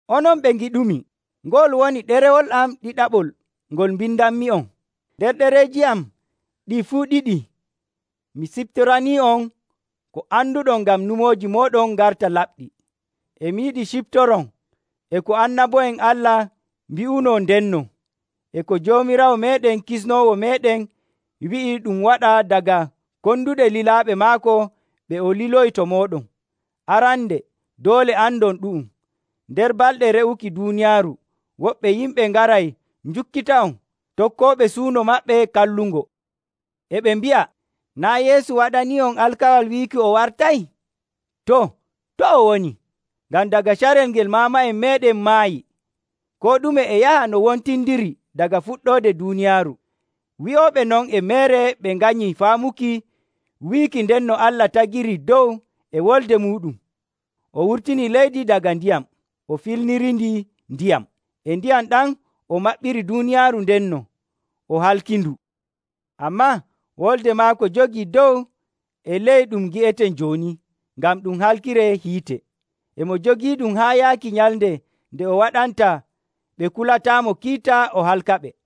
Onon ɓe ngiɗumi, ngo'ol woni ɗerewol am ɗiɗaɓol ngol mbindanmi'on. Nder ɗereeji am ɗi fuu ɗiɗi mi siftoranii'on ko anduɗon ngam nyumooji mooɗon ngarta laɓɗi. E mi yiɗi ciftoron e ko annabo'en Allah mbi'unoo ndenno, e ko Joomiraawo meeɗen Kisnoowo meeɗen wi'i ɗum waɗa daga konduɗe lilaaɓe maako ɓe o liloyi to mooɗon. Arande doole andon ɗu'um, nder balɗe re'uki duuniyaaru woɓɓe yimɓe ngaray njukkita'on, tokkooɓe suuno maɓɓe kallungo. E ɓe mbi'a, “Naa' Yeesu waɗanii'on alkawal wiiki o wartay? Too, to o woni? Ngam daga carel ngel maama'en meeɗen maayi, koo ɗume e yaha no wontindiri daga fuɗɗoode duuniyaaru.” Wi'ooɓe non e meere ɓe nganyi faamuki wiiki ndenno Allah tagirii dow e wolde muuɗum. O wurtini leydi daga ndiyam, o filniriindi ndiyam. E ndiyam ɗam o maɓɓiri duuniyaaru ndenno, o halkindu. Ammaa Wolde maako jogii dow e ley ɗum ngi'eten jooni ngam ɗum halkiree hiite. E mo jogiiɗum haa yaaki nyalnde nde o waɗanta ɓe kulataamo kiita o halkaɓe.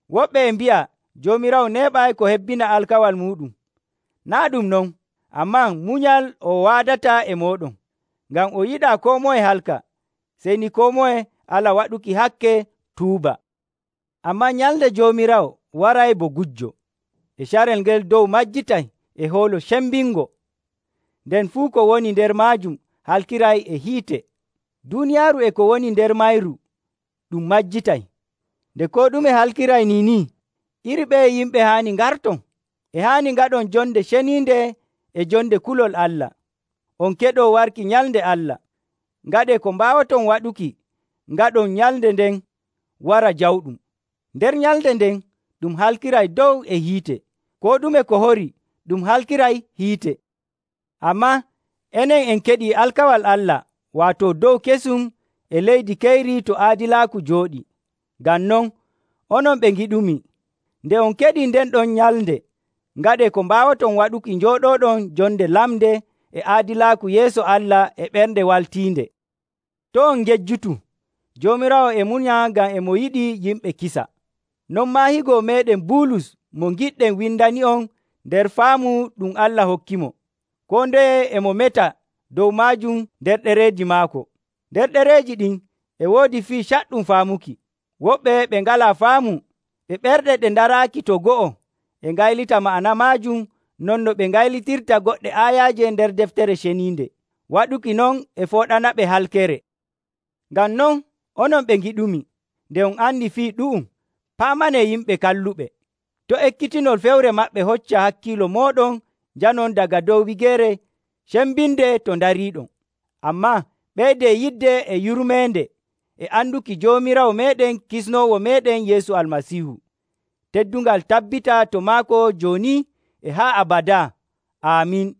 Woɓɓe e mbi'a Joomiraawo neeɓay ko hebbina alkawal muuɗum. Naa' ɗum non, ammaa munyal o waadata e mooɗon, ngam o yiɗaa koo moye halka, sey ni koo moye ala waɗuki hakke, tuuba. Ammaa nyalnde Joomiraawo waray bo gujjo. E carel ngel dow majjitay e hoolo cembingo. Nden fuu ko woni nder maajum halkiray e hiite. Duuniyaaru e ko woni nder mayru ɗum majjitay. Nde koo ɗume halkiray niini, iri ɓeye yimɓe haani ngarton? E haani ngaɗon jonde ceniinde e jonde kulol Allah, on keɗoo warki nyalnde Allah. Ngaɗee ko mbaawoton waɗuki ngaɗon nyalnde nden wara jawɗum. Nder nyalnde nden ɗum halkiray dow e hiite, koo ɗume ko horii ɗum halkiray hiite. Ammaa enen en keɗii alkawal Allah, waato dow kesum e leydi keyri to aadilaaku jooɗii. Ngam non, onon ɓe ngiɗumi, nde on keɗii nden ɗon nyalnde, ngaɗee ko mbaawoton waɗuki njooɗooɗon jonde lamnde e aadilaaku yeeso Allah e ɓernde waltiinde. To' on ngejjutu, Joomiraawo e munya ngam e mo yiɗi yimɓe kisa. Non maa higo meeɗen Bulus mo ngiɗɗen windani'on nder faamu ɗum Allah hokkimo. Koo ndeye e mo meta dow maajum nder ɗereeji maako. Nder ɗereeji ɗin e woodi fii caɗɗum faamuki. Woɓɓe ɓe ngalaa faamu, ɓe ɓerɗe ɗe ndaraaki to go'o e ngaylita ma'ana maajum non no ɓe ngaylitirta goɗɗe aayaaje nder Deftere Ceniinde. Waɗuki non e fooɗanaɓe halkere. Ngam non, onon ɓe ngiɗumi, nde on andi fii ɗu'um, paamanee yimɓe kalluɓe, to' ekkitinol fewre maɓɓe hocca hakkiilo mooɗon njanon daga dow wigeere cembinde to ndariiɗon. Ammaa ɓeydee yidde e yurmeende e anduki Joomiraawo meeɗen Kisnoowo meeɗen Yeesu Almasiihu. Teddungal tabbita to maako jooni e haa abadaa! Aamin.